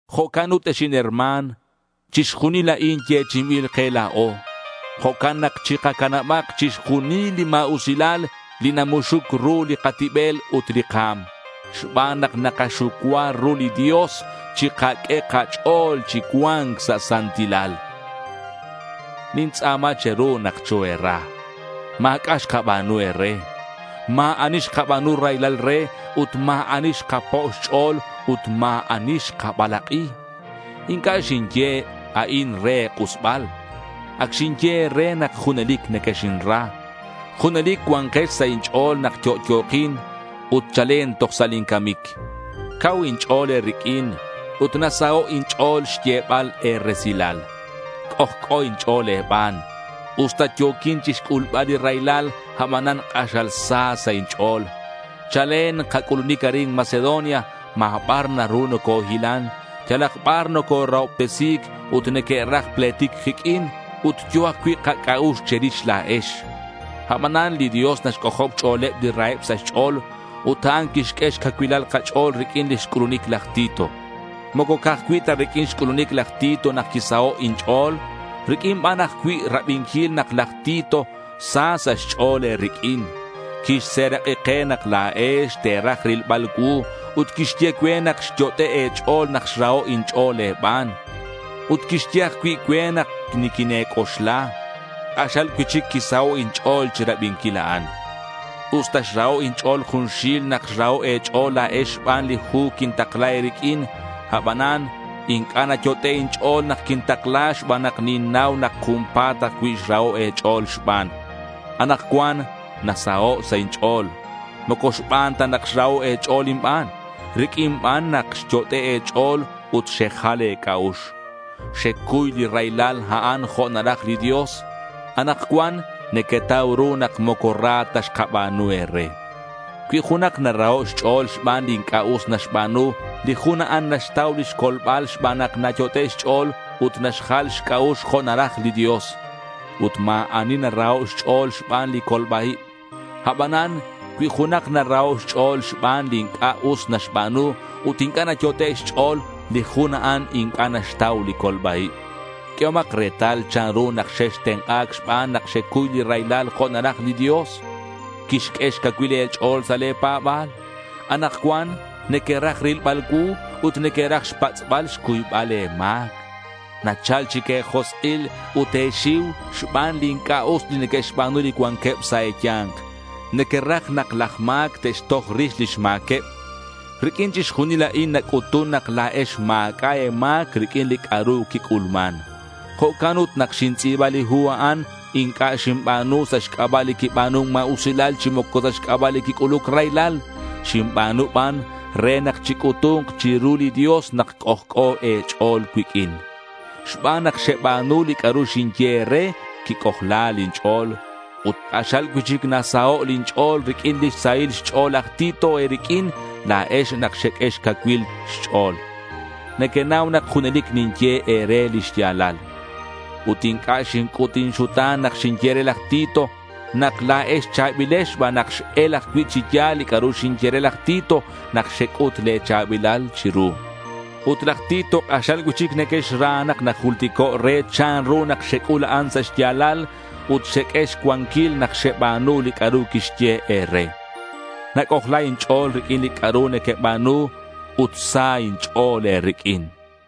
Jo'can ut ex inherma̱n, chixjunil a'in yechi'inbil ke la̱o. Jo'can nak chikacanabak chixjunil li ma̱usilal li namuxuc ru li katibel ut li ka̱m. Xban nak nakaxucua ru li Dios chikaq'ue kach'o̱l chi cua̱nc sa' santilal. Nintz'a̱ma che̱ru nak choe̱ra. Ma̱c'a' xkaba̱nu e̱re. Ma̱ ani xkaba̱nu raylal re ut ma̱ ani xkapo' xch'o̱l ut ma̱ ani xkabalak'i. Inc'a' xinye a'in re e̱k'usbal. Ac xinye e̱re nak junelic nequexinra. Junelic cua̱nkex sa' inch'o̱l nak yo'yo̱kin ut chalen toj sa' lin camic. Cau inch'o̱l e̱riq'uin ut nasaho' inch'o̱l xyebal e̱resilal. C'ojc'o inch'o̱l e̱ban. Usta yo̱quin chixc'ulbal li raylal, abanan k'axal sa sa' inch'o̱l. Chalen kac'ulunic arin Macedonia ma̱ bar naru nocohilan. Yalak bar nocorahobtesi̱c ut neque'raj pletic kiq'uin. Ut yo̱ ajcui' kac'a'ux che̱rix la̱ex. Abanan li Dios naxc'ojob xch'o̱leb li raheb sa' xch'o̱l. Ut a'an quixq'ue xcacuilal kach'o̱l riq'uin lix c'ulunic laj Tito. Moco ca'aj cui' ta riq'uin xc'ulunic laj Tito nak quisaho' inch'o̱l. Riq'uin ban ajcui' rabinquil nak laj Tito sa sa' xch'o̱l e̱riq'uin. Quixserak'i ke nak la̱ex te̱raj rilbal cuu ut quixye cue nak xyot'e' e̱ch'o̱l nak xraho' inch'o̱l e̱ban. Ut quixye ajcui' cue nak niquine̱c'oxla. K'axal cui'chic quisaho' inch'o̱l chirabinquil a'an. Usta xraho' inch'o̱l junxil nak xraho' e̱ch'o̱l la̱ex xban li hu quintakla e̱riq'uin, abanan inc'a' nayot'e' inch'o̱l nak quintakla xban nak ninnau nak junpa̱t ajcui' xraho' e̱ch'o̱l xban. Anakcuan nasaho' sa' inch'o̱l. Moco xban ta nak xraho' e̱ch'o̱l inban. Riq'uin ban nak xyot'e' e̱ch'o̱l ut xejal e̱c'a'ux. Xecuy li raylal a'an jo' naraj li Dios. Anakcuan nequetau ru nak moco ra ta xkaba̱nu e̱re. Cui junak naraho' xch'o̱l xban li inc'a' us naxba̱nu, li jun a'an naxtau lix colbal xban nak nayot'e' xch'o̱l ut naxjal xc'a'ux jo' naraj li Dios. Ut ma̱ ani naraho' xch'o̱l xban li colba-ib. Abanan cui junak naraho' xch'o̱l xban li inc'a' us naxba̱nu ut inc'a' nayot'e' xch'o̱l, li jun a'an inc'a' naxtau li colba-ib. Q'uehomak retal chanru nak xextenk'a̱c xban nak xecuy li raylal jo' naraj li Dios. Quixq'ue xcacuil e̱ch'o̱l sa' le̱ pa̱ba̱l. Anakcuan nequeraj rilbal cuu ut nequeraj xpatz'bal xcuybal le̱ ma̱c. Nachal chic e̱josk'il ut e̱xiu xban li inc'a' us li neque'xba̱nu li cuanqueb sa' e̱ya̱nk. Nequeraj nak laj ma̱c te'xtoj rix lix ma̱queb. Riq'uin chixjunil a'in nac'utun nak la̱ex ma̱c'a' e̱ma̱c riq'uin li c'a'ru quic'ulman. Jo'can ut nak xintz'i̱ba li hu a'an inc'a' xinba̱nu sa' xc'aba' li quiba̱nun ma̱usilal chi moco sa' xc'aba' li quic'uluc raylal. Xinba̱nu ban re nak chic'utu̱nk chiru li Dios nak c'ojc'o e̱ch'o̱l cuiq'uin. Xban nak xeba̱nu li c'a'ru xinye e̱re, quic'ojla lin ch'o̱l. Ut k'axal cui'chic nasaho' lin ch'o̱l riq'uin lix sahil xch'o̱l laj Tito e̱riq'uin la̱ex nak xeq'ue xcacuilal xch'o̱l. Nequenau nak junelic ninye e̱re li xya̱lal. Ut inc'a' xinc'ut inxuta̱n nak xinye re laj Tito nak la̱ex cha̱bilex xban nak x-el ajcui' chi ya̱l li c'a'ru xinye re laj Tito nak xec'ut le̱ cha̱bilal chiru. Ut laj Tito k'axal cui'chic nequexra nak najultico' re chanru nak xec'ul a'an sa' xya̱lal ut xeq'ue xcuanquil nak xeba̱nu li c'a'ru quixye e̱re. Nac'ojla inch'o̱l riq'uin li c'a'ru nequeba̱nu ut sa inch'o̱l e̱riq'uin.